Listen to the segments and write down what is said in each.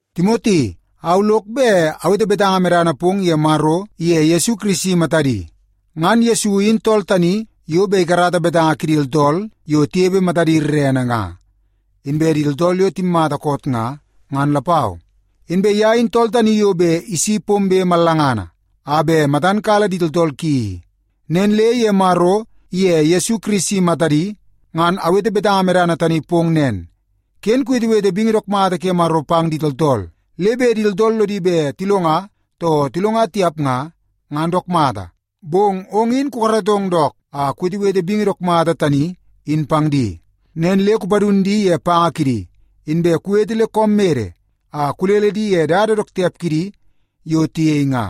Timoti, au lok bet awete betanga medana pong ye Maro iye Yesu Kirisi matadi. Ngan Yesu in tool tani yo bet ikarata betanga kidi tooltool yo tinepe matadi rerene nga, inbe di tooltool yo timmata koot nga, ngan lapau. Inbe ye in tool tani yo bet isi pombe mallangana a bet matan kala di tooltool ki i. Nen le ye Maro iye Yesu Kirisi matadi ngan awete betanga medana tani pong nen, ken kuwetewete bingi dook mata ke Maro pang di tooltool. Le bet di tooltool lodi bet tilonga too tilonga tiap nga, ngan dook mata, bong ong in kukaratong dook a kuwetewete bingi dook mata tani in pang di. Nen le kupadun di ye panga kidi, inbe kuwete le koom mede a kulele di ye dada dook tiap kidi yo tiyei nga,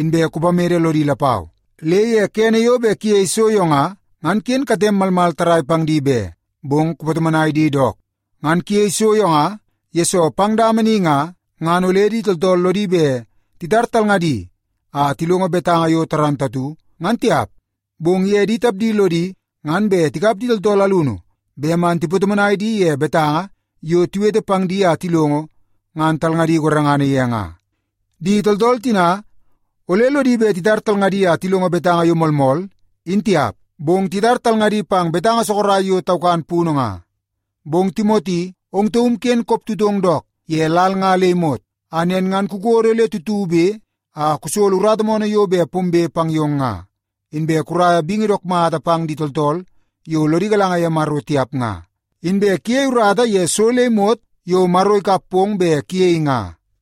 inbe kupamede lodi lapau. Le ye kene yo bet kuyei so yo nga, ngan ken katem malmal tarrai pang di be, bong kupatomonai di dook. Ngan kuyei so yo nga, yesoo pang dama ni nga, ngan ole di tooltool lodi bet titar talngadi a tilongo betanga yo moolmool, ngan tiap. Bong ye di tapdi lodi ngan bet tikap di tooltool alunu bet man tipatomonai di ye betanga yo tiwete pang di a tilongo, ngan talngadi gorengana ye nga. Di tooltool tina ole lodi bet titar talngadi a tilongo betanga yo moolmool in tiap, bong titar talngadi pang betanga sorok yo taukan punu nga. Bong Timoti, ong taum ken koptutong dook ye lal nga le imot a nen ngan kukodo le tutube a kusolo urata moonoo yo bet pombe pang yong nga, inbe kuraia bingi dook mata pang di tooltool yo lodi galanga ye Maro tiap nga, inbe kuyei urata ye so le imot yo Maro ikap pong bet kuyei nga.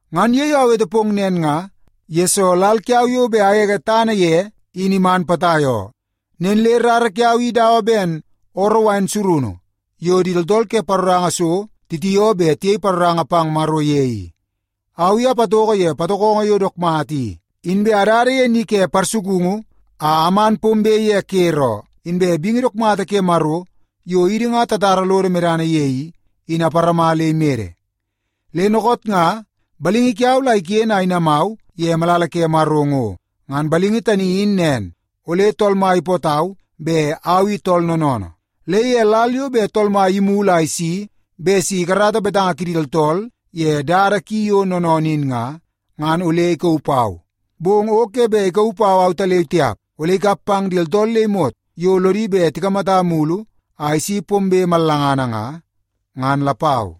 Ngan ye yo awete pong nen nga, yesoo lal kiau yo bet agege tana ye in iman potai oo. Nen le rara kiau i dawa ben ooroo wain surunu yo di tooltool ke paroranga so titioo bet tiyei paroranga pang Maro ye i. Au i apatoko ye patokongo yo dook mata i, inbe adada ye ni ke parsukungu a aman pombe ye ker oo, inbe bingi dook mata ke Maro yo idi nga tatara lodo medana ye i, in aparama le imede. Le dookoot nga balingi kiau la iken a inamau ye malala ke Maro ngo. Ngan balingi tani in nen ole Tool Mai ipootau bet au i tool noonoonoo. Le ye lal yo bet Tool Mai imulu a isi bet si ikarata betanga kidi tooltool ye dada ki yo noonoonoo in nga, ngan ole ikauu pau. Bong o ke bet ikauu pau autaleu tiap. Ole ikap pang di tooltool le imot yo lodi bet tikamata imulu a isi pombe mallangana nga, ngan lapau.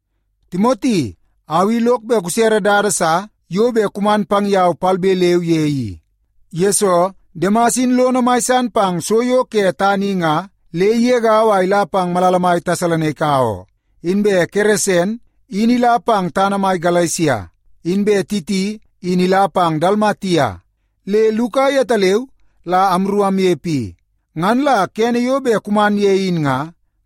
Timoti, au i lok bet kusere dada sa yo bet kuman pang yau palbe leu ye i. Yesoo, Demas in lono mai san pang so yo ke tana i nga le igegau a ila pang malala mai Tesalonaika oo. Inbe Keresen in ila pang tana mai Galesia, inbe Titi in ila pang Dalmatia. Le Luka yetaleu la amru amnepe i. Ngan la kene yo bet kuman ye in nga,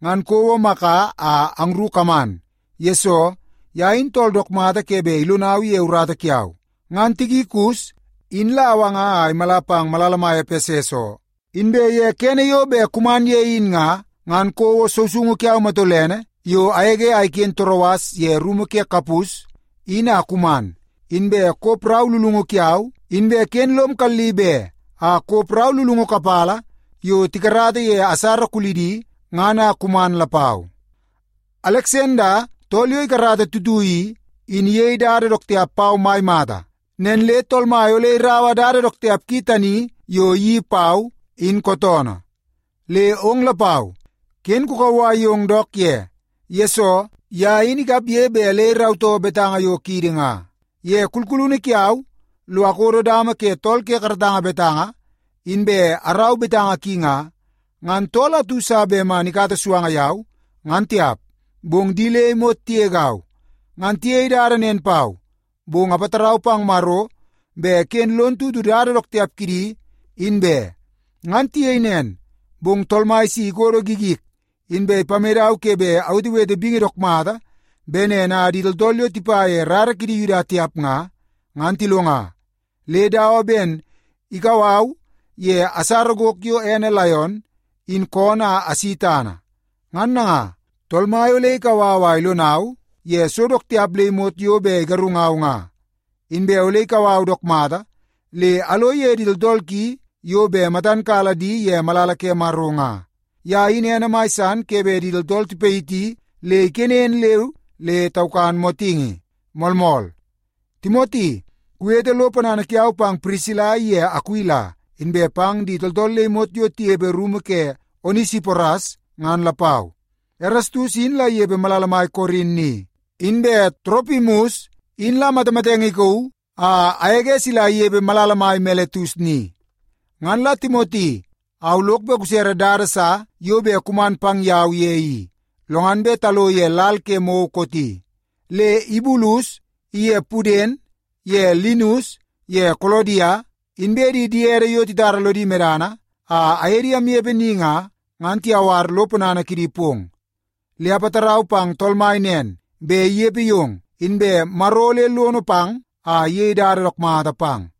ngan kouo Maka a angru kaman. Yesoo, ye in tool dook mata ke bet ilonau ye urata kiau. Ngan Tikikus in la awanga a imala pang malala mai Epeses oo. Inbe ye kene yo bet kuman ye in nga, ngan kouo sousoungu kiau matolene yo agege a iken Toroas ye rumu ke Kapus in a kuman. Inbe kop rau lulungu kiau, inbe ken lom kalli be a kop rau lulungu kapala yo tikarata ye asara kulidi ngan a kuman lapau. Aleksanda tool yo ikarata tuitui i, in iyei dada dook tiap pau mai mata. Nen le Tool Mai ole iraua dada dook tiap ki tani yo iyeii pau, in kootoonoo. Le ong lapau, ken kukauwai yong dook ye. Yesoo, ye in ikapge bet le irautoo betanga yo kiidi nga. Ye kulkulunu kiau lo akodo dama ke tool ke karatanga betanga inbe arau betanga ki nga, ngan tool atu sa bet man ikata suanga yau, ngan tiap. Bong di le imot tigegau. Ngan tiyei dada nen pau, bong apatarau pang Maro bet ken lon tutu dada dook tiap kidi, in be. Ngan tiyei nen, bong Tool Mai si ikodo gigik, inbe ipamedau ke bet awetewete bingi dook mata bet nen a di tooltool yo tipa ye rara kidi Yuda tiap nga, ngan tilonga. Le dawa ben ikau au ye asara gok yo ene laion in koonoo a asi tana. Ngan nanga, Tool Mai ole ikau au a ilonau ye so dook tiap le imot yo bet igarungau nga. Inbe ole ikau au dook mata le alo ye di tooltool ki yo bet matan kala di ye malala ke Maro nga. Ye in ene mai san ke bet di tooltool tipayiti le ikenen leu le taukan motingi. Moolmool. Timoti, kuwete lo ponana kiau pang Pirisila iye Akuila inbe pang di tooltool le imot yo tinepe rumu ke Onesiporas ngan lapau. Erastus in la inepe malala mai Korin ni. Inbe Toropimus in la matamatenge kauu a agege sila inepe malala mai Miletus ni. Ngan la Timoti au lok bet kusere dada sa yo bet kuman pang yau ye i, lo ngan bet talo ye lal ke mou kooti. Le Ibulus iye Puden ye Linus ye Kolodia, inbe di diede yo titara lodi medana a aye di amnepe ni nga, ngan tiyawar lo ponana kidi pong. Le apatarau pang Tool Mai nen, bet inepe yong, inbe Maro ole lono pang a iyei dada dook mata pang.